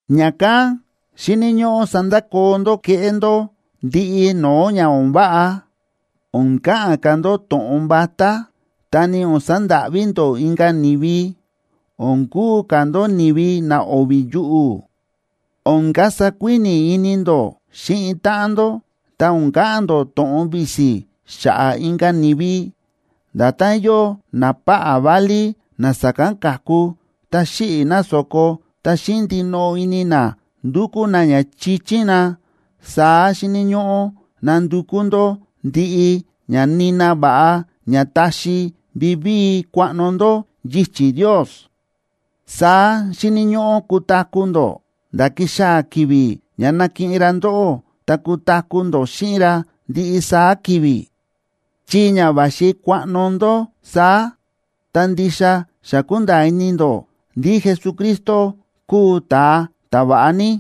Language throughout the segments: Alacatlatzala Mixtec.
Ña̱kán xíni̱ ñóꞌó sandakoo ndó kéꞌé ndó ndiꞌi no̱o̱ ña o̱n váꞌa, o̱n ka̱ꞌa̱n ka̱ ndó to̱ꞌon vatá, ta ni o̱n sandáꞌví ndó inka̱ ni̱vi; o̱n kuu ka̱ ndó ni̱vi na o̱vi̱ yuꞌu̱; o̱n kasa kuíni̱ ini ndó xíꞌin táꞌan ndó; ta o̱n ka̱ꞌa̱n ndó to̱ꞌon visi xa̱ꞌa̱ inka̱ ni̱vi. Nda̱tán yóo napáꞌá válí na sa̱kán ka̱ku, ta xíꞌi̱ na so̱ko ta xíꞌin ndinoꞌo ini na ndúkú na ña chichín na, saá xíni̱ ñóꞌó nandukú ndó ndiꞌi ña nina va̱ꞌa ña taxi vivíi kuaꞌno ndó yichi̱ Ndios, saá xíni̱ ñóꞌó kutaku̱ ndó nda̱ kixaa̱ ki̱vi̱ ña nakiꞌin ra ndóꞌó ta kutaku̱ ndó xíꞌin ra ndiꞌi saá ki̱vi̱. Chi ña va̱xi kuaꞌno ndó saá, ta ndixa xa kúnda̱a̱ ini ndó ndí Jesucristo kúu ta̱a ta̱va̱ꞌa ní.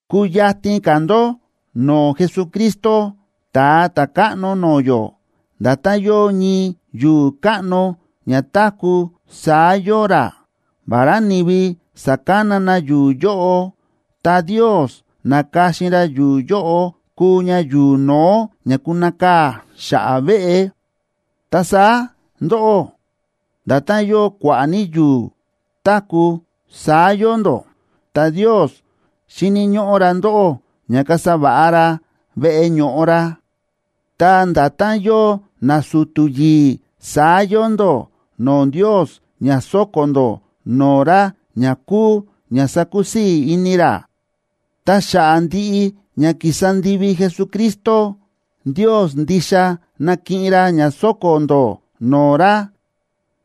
Kuyatin ka̱ ndó no̱o̱ Jesucristo, Ta̱a Ta̱káꞌno no̱o̱ yó; nda̱tán yóo ñii yu̱u̱ káꞌno ña táku̱, saá yóo ra. Vará ni̱vi sa̱kana na yu̱u̱ yóꞌo, ta Ndios na̱ka̱xin ra yu̱u̱ yóꞌo kuu ña yu̱u̱ no̱ó ña kunakaa̱ xa̱ꞌa̱ veꞌe. Ta saá ndóꞌó, nda̱tán yóo kua̱ꞌa̱ ní yu̱u̱ táku̱, saá yóo ndó. Ta Ndios xíni̱ ñóꞌó ra ndóꞌó ña kasa va̱ꞌa ra veꞌe ño̱ꞌo ra. Ta nda̱tán yóo nasu̱tu̱ yi̱i̱, saá yóo ndó no̱o̱ Ndios ña sóko̱ ndó no̱o̱ ra ña kúu ña sákusii̱ ini ra, ta xa̱ꞌa̱ ndiꞌi ña ki̱sa ndivi Jesucristo, Ndios ndixa nakiꞌin ra ña sóko̱ ndó no̱o̱ ra.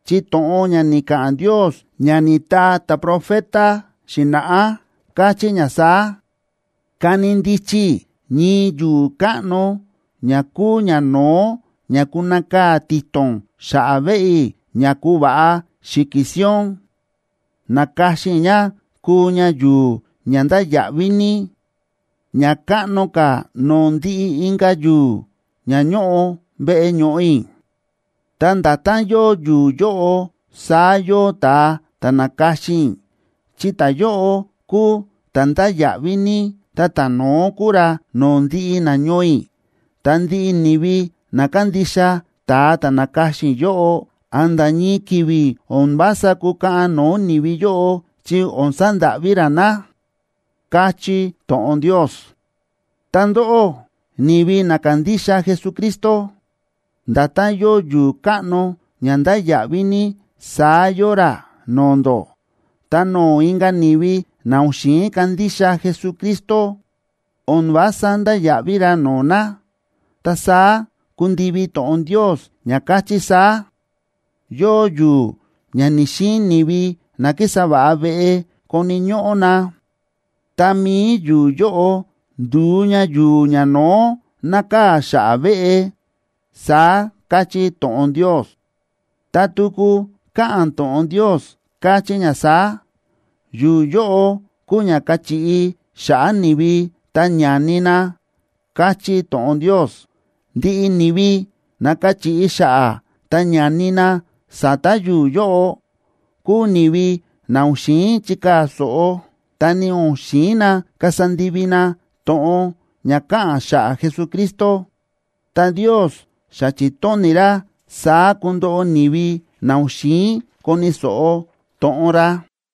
Chi to̱ꞌon ña ni̱ka̱ꞌa̱n Ndios ña ni̱taa ta̱profeta xi̱na̱ꞌá, káchí ña saá: Kani ndichi i̱ ñii yu̱u̱ káꞌno ña kúu ñano̱ó ña kunakaa̱ ti̱to̱n xa̱ꞌa̱ veꞌe i̱ ña kuva̱ꞌa Xi̱ki̱ Sion.a Na̱ka̱xin i̱ ña kuu ña yu̱u̱ ña ndáya̱ꞌví ní, ña káꞌno ka̱ no̱o̱ ndiꞌi inka̱ yu̱u̱ ña ñóꞌo veꞌe ño̱ꞌo i̱. Ta nda̱tán yóo yu̱u̱ yóꞌo, saá yóo ta̱a ta̱ na̱ka̱xin i̱; chi ta̱yóꞌo kuu ta̱ ndáya̱ꞌví ní, ta ta̱no̱ó kuu ra no̱o̱ ndiꞌi nañoo i̱, ta ndiꞌi ni̱vi na kándixa ta̱a ta̱ na̱ka̱xin i̱ yóꞌo, a̱nda̱ ñii ki̱vi̱ o̱n vása kukaꞌan no̱o̱ ni̱vi yóꞌo chi o̱n sandáꞌví ra na, káchí to̱ꞌon Ndios. Ta ndóꞌó ni̱vi na kándixa Jesucristo, nda̱tán yóo yu̱u̱ káꞌno ña ndáya̱ꞌví ní, saá yóo ra no̱o̱ ndó, ta no̱o̱ inka̱ ni̱vi na o̱n xi̱in kandixa Jesucristo, o̱n vása ndáya̱ꞌví ra no̱o̱ na, ta saá kúndivi to̱ꞌon Ndios ña káchí saá: Yóo yu̱u̱ ña ni̱‑xiin ni̱vi na kísa va̱ꞌa veꞌe koni̱ ñóꞌó na, ta mi̱i yu̱u̱ yóꞌo ndu̱u ña yu̱u̱ ñano̱ó nákaa̱ xa̱ꞌa̱ veꞌe, saá káchí to̱ꞌon Ndios. Ta tuku káꞌa̱n to̱ꞌon Ndios, káchí ña saá: Yu̱u̱ yóꞌo kúu ña káchiꞌi xa̱ꞌa̱ ni̱vi ta ñání na, káchí to̱ꞌon Ndios. Ndiꞌi ni̱vi na káchiꞌi xa̱ꞌa̱ ta ñání na sa̱ta̱ yu̱u̱ yóꞌo kúu ni̱vi na o̱n xi̱in chikaa̱ so̱ꞌo, ta ni o̱n xi̱in na kasa ndivi na to̱ꞌon ña káꞌa̱n xa̱ꞌa̱ Jesucristo. Ta Ndios xa chi̱tóni̱ ra saá kundoꞌo ni̱vi na o̱n xi̱in koni̱ so̱ꞌo to̱ꞌon ra.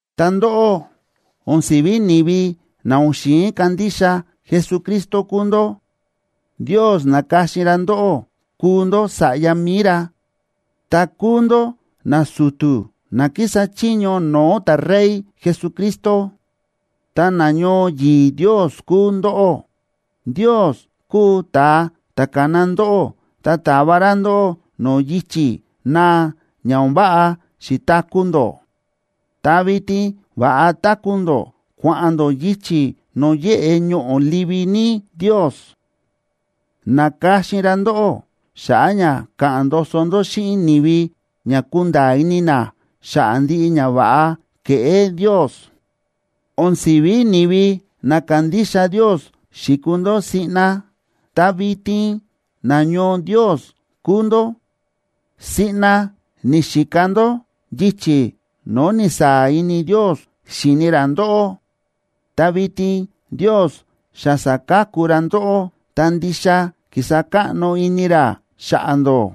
Ta ndóꞌó, o̱n si̱ví ni̱vi na o̱n xi̱in kandixa Jesucristo kúu ndó. Ndios na̱ka̱xin ra ndóꞌó kuu ndó sa̱ꞌya mi̱i ra. Ta kúu ndó nasu̱tu̱ na kísa chiño no̱o̱ ta̱Rey Jesucristo, ta nañoo yi̱i̱ Ndios kúu ndóꞌó. Ndios kúu ta̱a ta̱ ka̱na ndóꞌó ta ta̱va ra ndóꞌó no̱o̱ yichi̱ naa ña o̱n váꞌa xi̱taku̱ ndó, ta vitin va̱ꞌa táku̱ ndó kua̱ꞌa̱n ndó yichi̱ no̱o̱ yéꞌe ñoꞌo̱ livi ní Ndios. Na̱ka̱xin ra ndóꞌó xa̱ꞌa̱ ña ka̱ꞌa̱n ndoso ndó xíꞌin ni̱vi ña kunda̱a̱ ini na xa̱ꞌa̱ ndiꞌi ñava̱ꞌa ke̱ꞌé Ndios. O̱n si̱ví ni̱vi na kándixa Ndios xi̱kuu ndó siꞌna, ta vitin nañoo Ndios kúu ndó; siꞌna ni̱xika ndó yichi̱ no̱o̱ ni̱saa̱ ini Ndios xíni ra ndóꞌó, ta vitin Ndios xa sa̱ka̱ku ra ndóꞌó, ta ndixa ki̱sa káꞌno ini ra xa̱ꞌa̱ ndó.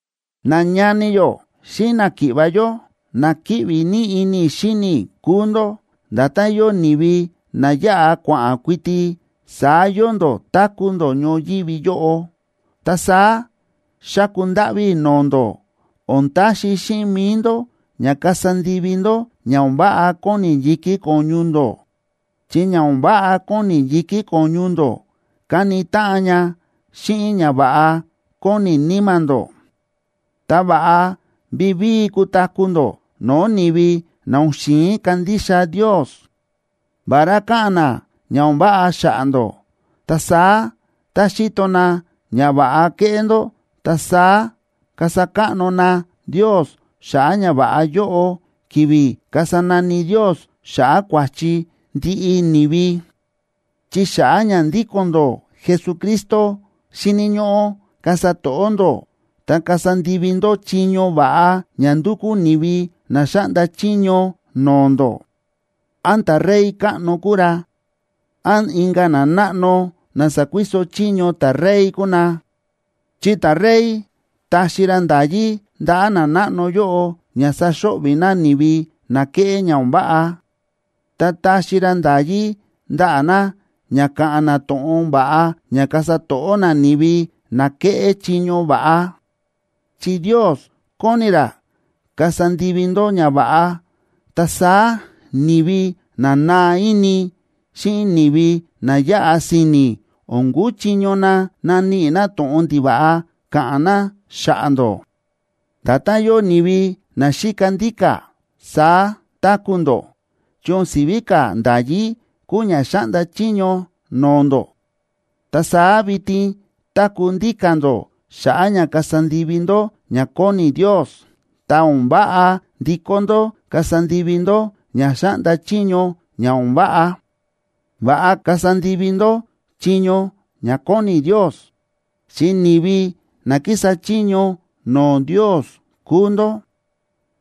Nañani yó xíꞌin náki̱ꞌva̱ yó, na kíꞌvi ní ini i̱ xíni i̱ kúu ndó. Nda̱tán yóo ni̱vi na yáꞌa kua̱ꞌa̱n kuiti, saá yóo ndó táku̱ ndó ñoyívi yóꞌo. Ta saá xáku ndáꞌví i̱ no̱o̱ ndó, o̱n taxi xíꞌin mi̱i ndó ña kasa ndivi ndó ña o̱n váꞌa kóni yi̱kí ko̱ñu ndó, chi ña o̱n váꞌa kóni yi̱kí ko̱ñu ndó káni táꞌan ña xíꞌin ñava̱ꞌa kóni níma̱ ndó. Ta va̱ꞌa vivíi kutaku̱ ndó no̱o̱ ni̱vi na o̱n xi̱in kandixa Ndios. Vará káꞌa̱n na ña o̱n váꞌa xa̱ꞌa̱ ndó, ta saá tá xíto na ñava̱ꞌa kéꞌé ndó, ta saá kasa káꞌno na Ndios xa̱ꞌa̱ ñava̱ꞌa yóꞌo ki̱vi̱ kasa nani Ndios xa̱ꞌa̱ kua̱chi ndiꞌi ni̱vi. Chi xa̱ꞌa̱ ña ndíko̱n ndó Jesucristo, xíni̱ ñóꞌó kasa to̱ꞌó ndó ta kasa ndivi ndó chiño va̱ꞌa ña ndúkú ni̱vi na xáꞌnda chiño no̱o̱ ndó, án ta̱rey káꞌno kúu ra, án inka̱ nanáꞌno na sa̱kuiso chiño ta̱rey kúu na. Chi ta̱rey ta̱xi ra nda̱yí ndaꞌa̱ nanáꞌno yóꞌo ña saxo̱ꞌvi̱ na ni̱vi na kéꞌé ña o̱n váꞌa, ta ta̱xi ra nda̱yí ndaꞌa̱ na ña ka̱ꞌa̱n na to̱ꞌon va̱ꞌa ña kasa to̱ꞌó na ni̱vi na kéꞌé chiño va̱ꞌa. Chi Ndios kóni ra kasa ndivi ndó ñava̱ꞌa, ta saá ni̱vi na naa ini xíꞌin ni̱vi na yáꞌa si̱ni̱ o̱n kuchiño na naníꞌi na to̱ꞌon ndiva̱ꞌa ka̱ꞌa̱n na xa̱ꞌa̱ ndó. Nda̱tán yóo ni̱vi na xíka ndíka̱, saá táku̱ ndó. Chi o̱n si̱ví ka̱ nda̱yí kúu ña xáꞌnda chiño no̱o̱ ndó. Ta saá vitin táku̱ ndíka̱ ndó xa̱ꞌa̱ ña kasa ndivi ndó ña kóni Ndios, ta o̱n váꞌa ndikó ndó kasa ndivi ndó ña xáꞌnda chiño ña o̱n váꞌa. Va̱ꞌa kasa ndivi ndó chiño ña kóni Ndios, chi ni̱vi na kísa chiño no̱o̱ Ndios kúu ndó.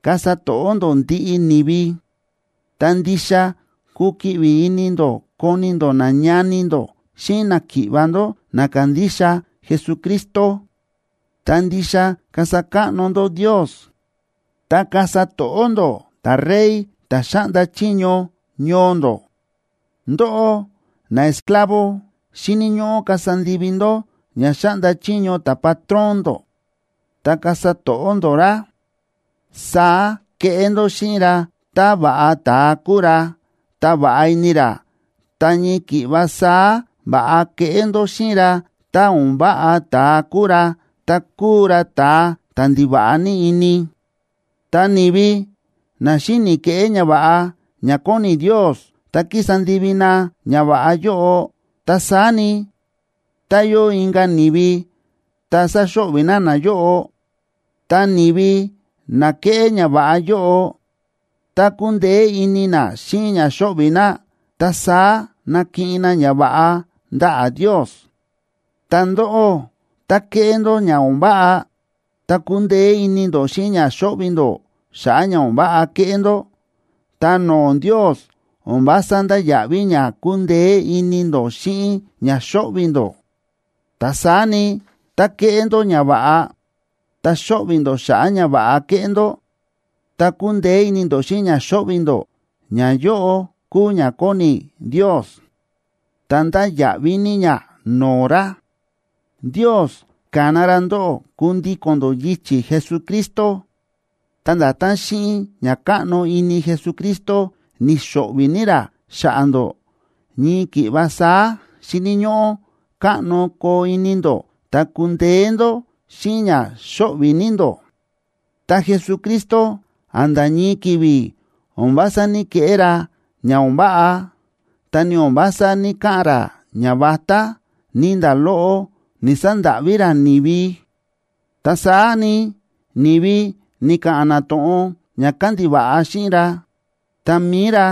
Kasa to̱ꞌó ndó ndiꞌi ni̱vi. Ta ndixa kukiꞌvi ini ndó koni ndó nañani ndó xíꞌin náki̱ꞌva̱ ndó na kándixa Jesucristo. Ta ndixa kasa káꞌno ndó Ndios. Ta kasa to̱ꞌó ndó ta̱rey ta̱ xáꞌnda chiño ñoo ndó. Ndóꞌó naesclavo, xíni̱ ñóꞌó kasa ndivi ndó ña xáꞌnda chiño ta̱patrón ndó ta kasa to̱ꞌó ndó ra. Saá keꞌé ndó xíꞌin ra tá va̱ꞌa ta̱a kúu ra, ta va̱ꞌa ini ra, ta ñii ki̱ꞌva saá va̱ꞌa keꞌé ndó xíꞌin ra tá o̱n váꞌa ta̱a kúu ra, ta kúu ra ta̱a ta̱ ndiva̱ꞌa ní ini. Ta ni̱vi na xíni̱ keꞌé ñava̱ꞌa ña kóni Ndios ta kísa ndivi na ñava̱ꞌa yóꞌo, ta saá ni, ta yóo inka̱ ni̱vi ta sáxo̱ꞌvi̱ na nayóꞌo, ta ni̱vi na kéꞌé ñava̱ꞌa yóꞌo ta kúndeé ini na xíꞌin ña xóꞌvi̱ na, ta saá nakiꞌin na ñava̱ꞌa ndaꞌa̱ Ndios. Ta ndóꞌó, tá ke̱ꞌé ndó ña o̱n váꞌa ta kúndeé ini ndó xíꞌin ña xóꞌvi̱ ndó xa̱ꞌa̱ ña o̱n váꞌa ke̱ꞌé ndó, ta no̱o̱ Ndios o̱n vása ndáya̱ꞌví ña kúndeé ini ndó xíꞌin ña xóꞌvi̱ ndó. Ta saá ni, tá ke̱ꞌé ndó ñava̱ꞌa, ta xóꞌvi̱ ndó xa̱ꞌa̱ ñava̱ꞌa ke̱ꞌé ndó, ta kúndeé ini ndó xíꞌin ña xóꞌvi̱ ndó, ñayóꞌo kúu ña kóni Ndios, ta ndáya̱ꞌví ní ña no̱o̱ ra. Ndios ka̱na ra ndóꞌó kundíko̱n ndó yichi̱ Jesucristo, ta nda̱tán xíꞌin ña káꞌno ini Jesucristo ni̱xo̱ꞌvi̱ ní ra xa̱ꞌa̱ ndó, ñii ki̱ꞌva saá xíni̱ ñóꞌó káꞌno koo ini ndó ta kundeé ndó xíꞌin ña xóꞌvi̱ ní ndó. Ta Jesucristo, a̱nda̱ ñii ki̱vi̱ o̱n vása ní‑keꞌé ra ña o̱n váꞌa, ta ni o̱n vása ní‑kaꞌa̱n ra ñavatá, ni nda̱ loꞌo ni̱‑sandáꞌví ra ni̱vi. Ta saá ni, ni̱vi ni̱ka̱ꞌa̱n na to̱ꞌon ña kándiva̱ꞌa xíꞌin ra, ta mi̱i ra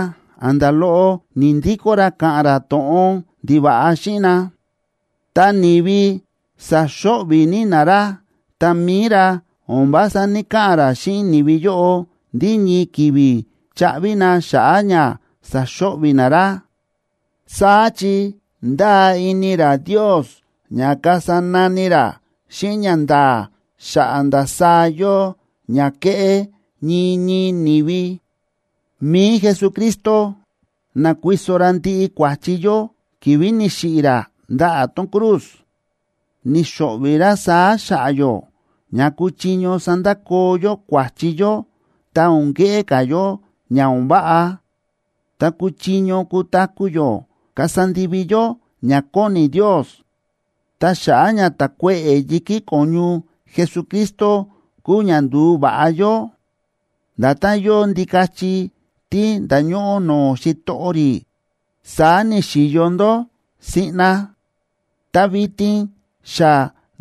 a̱nda̱ loꞌo ni̱‑ndikó ra ka̱ꞌa̱n ra to̱ꞌon ndiva̱ꞌa xíꞌin na. Tá ni̱vi sa̱xo̱ꞌvi̱ ní na ra, ta mi̱i ra o̱n vása ní‑kaꞌa̱n ra xíꞌin ni̱vi yóꞌo ndí ñii ki̱vi̱ chaꞌvi na xa̱ꞌa̱ ña sa̱xo̱ꞌvi̱ na ra. Saá chi ndáa ini ra Ndios ña kasa nani ra xíꞌin ñanda̱a̱ xa̱ꞌa̱ ndasaá yóo ña ke̱ꞌé ñii ñii ni̱vi. Mi̱i Jesucristo na̱kuiso ra ndiꞌi kua̱chi yó ki̱vi̱ ni̱xiꞌi̱ ra ndaꞌa̱ tón cruz. Ni̱xo̱ꞌvi̱ ra saá xa̱ꞌa̱ yó ña kuchiño sandakoo yó kua̱chi yó ta o̱n keꞌé ka̱ yó ña o̱n váꞌa, ta kuchiño kutaku̱ yó kasa ndivi yó ña kóni Ndios. Ta xa̱ꞌa̱ ña ta̱kuéꞌe̱ yi̱kí ko̱ñu Jesucristo kúu ña ndu̱va̱ꞌa yó. Nda̱tán yóo ndikachi tí nda̱ñóꞌó no̱o̱ xitoꞌo rí, saá ni̱xi̱yo ndó siꞌna. Ta vitin xa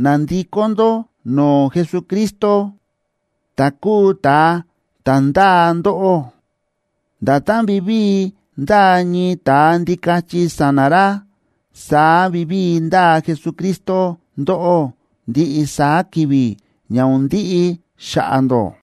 na̱ndikó ndó no̱o̱ Jesucristo, ta̱ kúu ta̱a ta̱ ndáa ndóꞌó. Nda̱tán vivíi ndáa ñii ta̱a ndikachi sa̱na̱ ra, saá vivíi ndáa Jesucristo ndóꞌó ndiꞌi saá ki̱vi̱, ña o̱n ndiꞌi xa̱ꞌa̱ ndó.